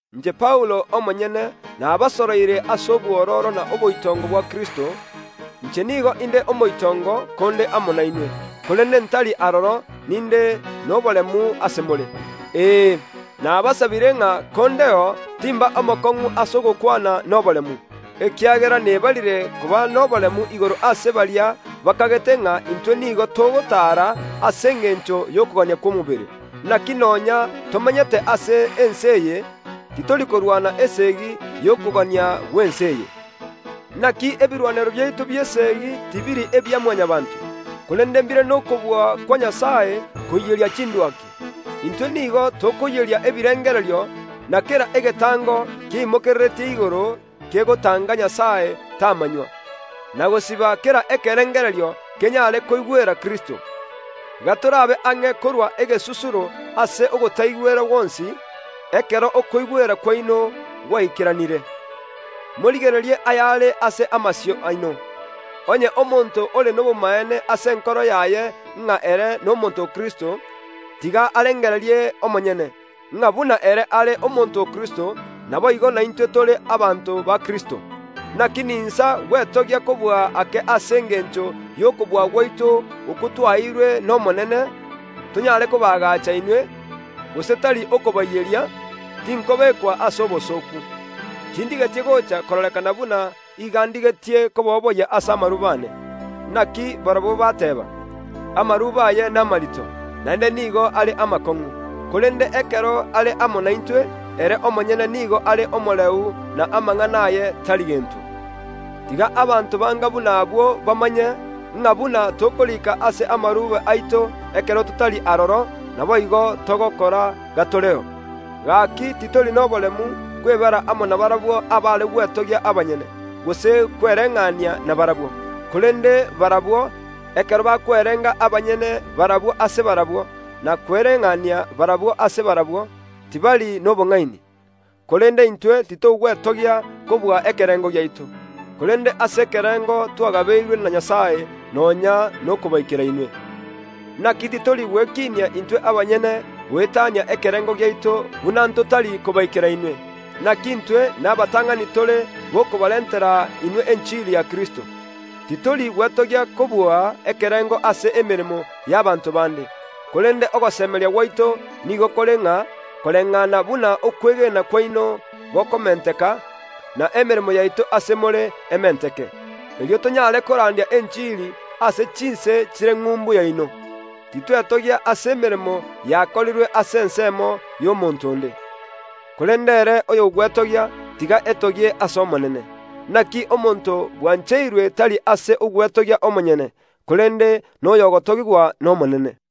Inche Paulo omonyene nabasoroire ase obwororo na oboitongo bwa Kristo, inche nigo inde omoitongo konde amo nainwe, korende ntari aroro ninde noboremu ase more. Ee, nabasabire ng’a kondeo timba omokong’u ase ogokwana noboremu, ekiagera nebarire koba noboremu igoro ase baria bakagete ng’a intwe nigo togotaara ase engencho y’okogania kw’omobere. Naki nonya tomenyete ase ense eye, titori korwana esegi y’okogania gw’ense eye. Naki ebirwanero biaito bi’eseegi tibiri ebia Mwanyabaanto, korende mbire nokobua kwa Nyasae koiyeria chindwaki. Intwe nigo tokoiyeria ebirengererio na kera egetango kieimokereretie igoro kegotanga Nyasae tamanywa, na gosiba kera ekerengererio kenyare koigwera Kristo; gatorabe ang’e korua egesusuro ase ogotaigwera gwonsi, ekero okoigwera kwaino gwaikeranire. Morigererie ayare ase amasio aino. Onye omonto ore nobomaene ase enkoro yaye ng’a ere nomonto o Kristo, tiga arengererie omonyene, ng’a buna ere are omonto o Kristo, naboigo naintwe tore abanto ba Kristo. Naki ninsa gwetogia kobua ake ase engencho y’okobua gwaito okwo twaeirwe n’Omonene, tonyare kobaagacha inwe, gose tari okobaiyeria, tinkobekwa ase obosooku. Tindigeti gocha kororekana buna iga ndigetie koboboyia ase amarube aane. Naki barabwo bateba, “Amarube aye namarito, naende nigo are amakong’u, korende ekero are amo naintwe ere omonyene nigo are omoreu, na amang’ana aye tari gento.” Tiga abanto banga buna abwo bamanye, ng’a buna tokoriika ase amarube aito ekero totari aroro, naboigo togokora gatoreo. Gaki titori noboremu kwebara amo nabarabwo abare gwetogia abanyene, gose kwereng’ania nabarabwo. Korende barabwo, ekero bakwerenga abanyene barabwo ase barabwo, na kwereng’ania barabwo ase barabwo, tibari nobong’aini. Korende intwe titogwetogia kobua ekerengo giaito, korende ase ekerengo twagabeirwe na Nyasae, nonya nokobaikera inwe. Naki titori gwekinia intwe abanyene goetania ekerengo giaito buna ntotari kobaikera inwe. Naki intwe nabatang’ani tore b’okobarentera inwe enchiri ya Kristo. Titori gwetogia kobua ekerengo ase emeremo y’abanto bande; korende ogosemeria gwaito nigo kore ng’a koreng’ana buna okwegena kwaino gokomenteka, na emeremo yaito ase more ementeke. Erio tonyare korandia enchiri ase chinse chire ng’umbu yaino, titwetogia ase emeremo yakorirwe ase ensemo y’omonto onde. “Korende ere oyogwetogia tiga etogie ase Omonene.” Naki omonto bwancheirwe tari ere ogwetogia omonyene, korende noyo ogotogigwa n’Omonene.